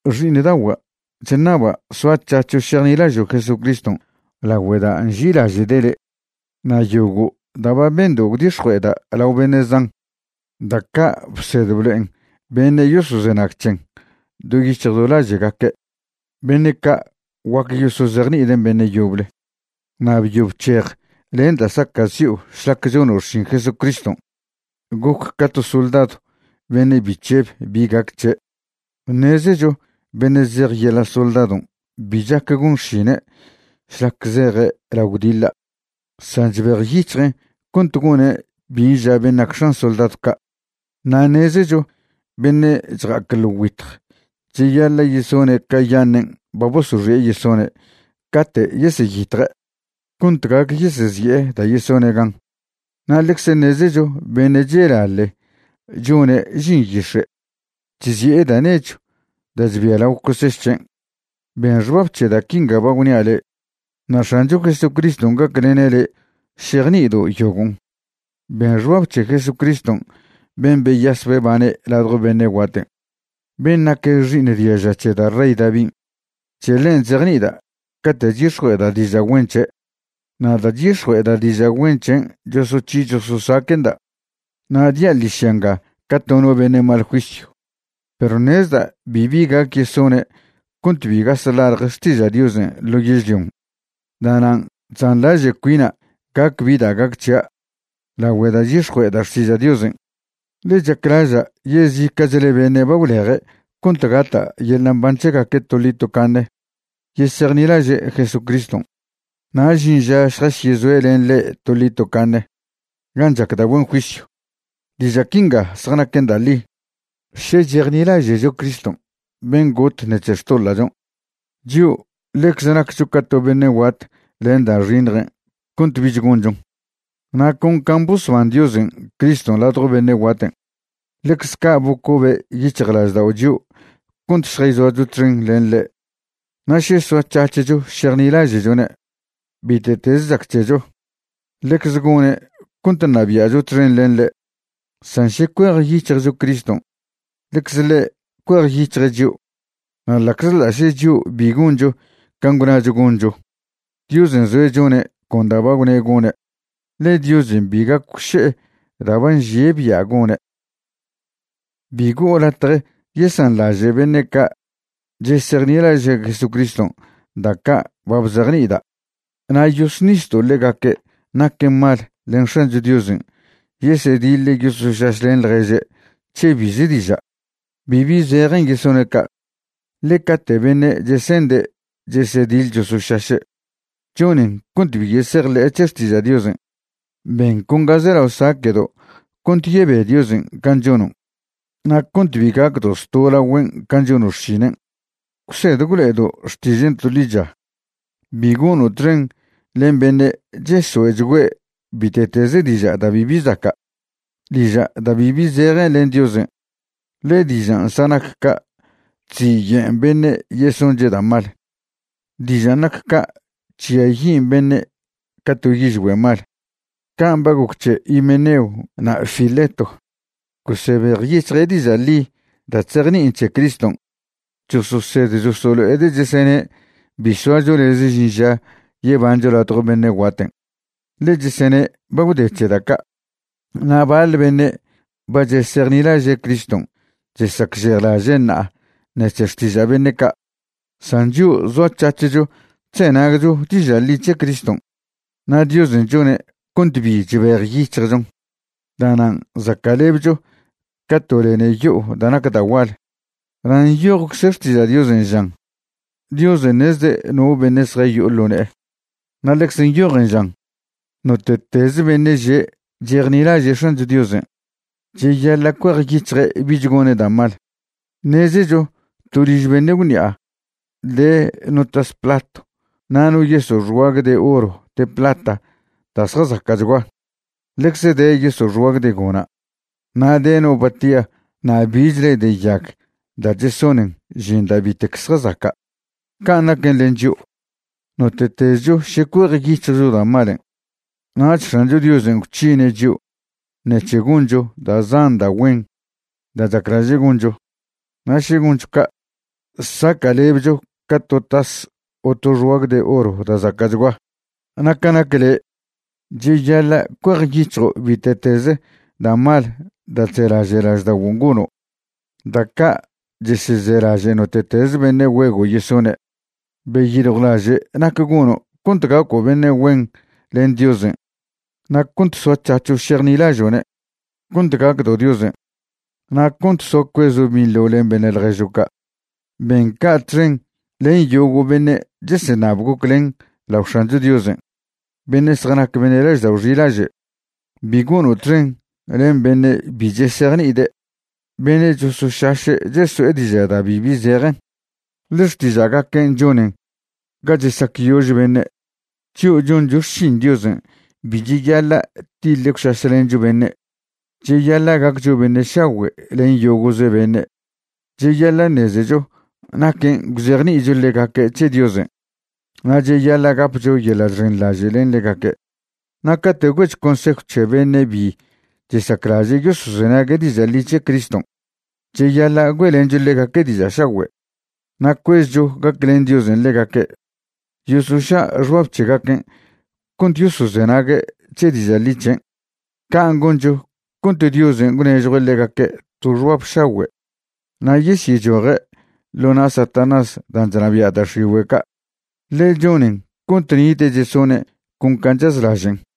Xi'iṉdagua', chṉaba' soac̱hac̱ho' šejnilažo' Jesucriston' lagüe' da' nži'ilaže'de' le'. Na' yogo' da' ba bendo' gwdix̱jue'eda' lao beṉe' zan, da' ca' bsed blo'en beṉe' yosozenag c̱hen do yic̱hj do laže'gaque', beṉe' ca' guac yosozejni'iden' beṉe' yoble. Na' byo bc̱hej len da' saca'zi'o šlac chono' xšin Jesucriston'. Goc ca to soldadw beṉe' bi chžeb bi gac c̱he'. Ṉezecho beṉe' zej yeḻa' soldadon' bi chac gon xšine' šlac zeje' lao gwdiḻa', san chbejyic̱hjen' cont gone' bin' ža ben' nac x̱an soldadw ca'. Na' ṉezecho beṉe' chja'ac ḻo güitj cheyaḻa' yesone' cayaṉen' ba bosoxi'e yesone' cate' yeseyitje', cont gac yesezi'e da' yesone' gan. Na' ḻeze ṉezecho beṉe' chelaḻe chone' žin yix̱e' chzi'e da' nechw da' chbia lao coseš c̱hen'. Ben xbab c̱he da' quinga ba gwnia' le', na' X̱ancho Jesucriston' gaclene' le' šejni'ido' yogon'. Ben xbab c̱he Jesucristw ben' beyas bebane' ladjo beṉe' guaten', ben' nac xi'iṉ diaža c̱he da' rey Davin'. C̱he ḻen' chzejni'ida' cate' chyix̱jue'eda' diža' güen c̱he'. Na' da' chyix̱jue'eda' diža' güen c̱hen' chosoc̱hi chososaque'nda' na' dia' ḻižya nga ca to no beṉe' mal juisyw. Perw ṉezda' bibi gac yesone' cont bi gas ḻalje xtiža' Diosen' ḻo yežlion'. Da'nan' chzanḻaže' cuina' gac bi da' gac c̱hia' lagüe da' chyix̱jue'eda' xtiža' Diosen', ḻe chaclaža' yezica'chle beṉe' ba gwleje' cont gata' yeḻa' mban c̱hegaque' toḻi tocaṉe yesejnilaže' Jesucriston', na' žin ža šjasyezoe' len ḻe' toḻi tocaṉe gan' chac da' güen juisyw. Diža' quinga zjanaquen da' ḻi: Še chejnilaže'cho Criston' ben' got ṉec̱he xtoḻa'chon', chio' ḻecze naccho ca to beṉe' guat len da' xiṉjen' cont bich gonchon. Na' con can' bosban Diosen' Criston' ladjo beṉe' guaten', ḻecze ca' bocobe' yic̱hjlaždao' chio' cont šjayzoacho txen len ḻe'. Na' še soac̱hac̱hcho šejnilaže'chone' bite'teze chac c̱hecho, ḻecze gone' cont ṉabia'cho txen len ḻe'. San še cuejyic̱hjcho Criston', ḻecze ḻe' cuejyic̱hje' chio'. Na' ḻa'czḻa' še chio' bi goncho can' gwnacho goncho, Diosen' zoe' chone' con da' ba gwne' gone', ḻe Diosen' bi gac gwše'e da' ba nžie' bia' gone'. Bi go'o latje yesanḻaže' beṉe' ca' chesejnilaže' Jesucriston' da' ca' ba bzejni'ida'. Na' yosnisdo' ḻegaque' naquen mal len X̱ancho Diosen' yesediḻ yosošašlen ḻježe' c̱he bize diža'. Bibi zejen yesone' ca', ḻe cate' beṉe' chesende' chesediḻ chosošaše', chonen cont bi yesejḻe'e c̱he xtiža' Diosen'. Ben con ga zelao saque'do' cont yebe Diosen' can' chonon' na' cont bi gacdo' zto' lagüen' can' chono' xšinen'. Gwsed gwlo'edo' xtižen' to ḻicha. Bi gono' txen len beṉe' chesoe'chgüe' bite'teze diža' da' bibi zaca', diža' da' bibi zejen len Diosen', ḻe dižan' zjanac ca' chziyen' beṉe' yesonche' da' mal. Dižan' nac ca' chžiayin' beṉe' ca to yižgüe' mal. Can' ba goc c̱he Himeneo na' Fileto, gosebejyic̱hje' diža' ḻi da' chzejni'in c̱he Criston'. Chososed chosolo'ede' chesene' bi soacho lez žin ža yebancho ladjo beṉe' guaten', ḻe chesene' ba gwde c̱he da' ca'. Na' baḻ beṉe' ba chesejnilaže' Criston' chesacžejlaže' ṉa'a ṉec̱he xtiža' beṉe' ca'. San chio' zoac̱hac̱hcho chzenagcho diža' ḻi c̱he Criston' na' Diosen' chone' cont bi chbejyic̱hjchon. Da'nan' zaca'lebcho ca to lene yo'o da' nac da' gual. Na' nyojcze Xtiža' Diosen' žan: “Diosen' ṉezde' no beṉe' zjayo'o ḻo ne'e.” Na' ḻecze nyojen žan: “Note'tez beṉe' že' chejnilaže' X̱ancho Diosen', cheyaḻa' cuejyic̱hje' bich gone' da' mal.” Ṉezecho to liž beṉe' gwṉi'a de no tas platw na' no yeso' xguag de oro de plata da' zjazaca'chgua. Ḻecze de yeso' xguag de gona', na' de no batia na' bichle de yag da' chesonen žin da' bitec zjazaca'. Can' naquen len chio', note'tezcho še cuejyic̱hjcho da' malen', nach X̱ancho Diosen' gwc̱hine' chio' ṉec̱he goncho da' zan da' güen da' chaclaže' goncho. Na' še goncho ca', saca'lebcho ca to tas o to xguag de oro da' zaca'chgua. Na' ca nac le', cheyaḻa' cuejyic̱hjo' bite'teze da' mal da' chzelaže' lažda'oguon' gono', da' ca' chesezelaže' note'teze beṉe' güego' yesone'. Beyiljwlaže' nac gono' cont gaco' beṉe' güen len Diosen' na' cont soac̱hac̱ho' šejnilažo'ne', cont gacdo' Diosen', na' cont soa cuezo' binḻo len beṉe' ḻježo' ca'. Ben ca' txen len yogo' beṉe' cheseṉab goclen lao X̱ancho Diosen', beṉe' zjanac beṉe' laždao' xilaže'. Bi gono' txen len beṉe' bi chesejni'ide', beṉe' chosošaše' cheso'e diža' da' bibi zejen, ḻe xtiža'gaquen' chonen ga chesacyož beṉe'. Chio' choncho xšin Diosen' bi cheyaḻa' tiḻe gwšašlencho beṉe'. Cheyaḻa' gaccho beṉe' šagüe' len yogo'ze beṉe', cheyaḻa' ṉezecho naquen' gwzejni'icho ḻegaque' c̱he Diosen', na' cheyaḻa' gapcho yeḻa' chxenḻaže' len ḻegaque'. Na' cate' güe'cho consejw c̱he beṉe' bi chesaclaže' yosozenague' diža' ḻi c̱he Criston', cheyaḻa' güe'lencho ḻegaque' diža' šagüe', na' cuezcho gaclen Diosen' ḻegaque' yosoša' xbab c̱hegaquen' cont yosozenague' c̱he diža' ḻi c̱hen'. Can' goncho cont Diosen' gwnežjue' ḻegaque' to xbab šagüe' na' yesyechoje' ḻo na' Satanás dan' chnabia' da' x̱igüe' ca', ḻe chonen cont nite' chesone' con can' chazlažen'.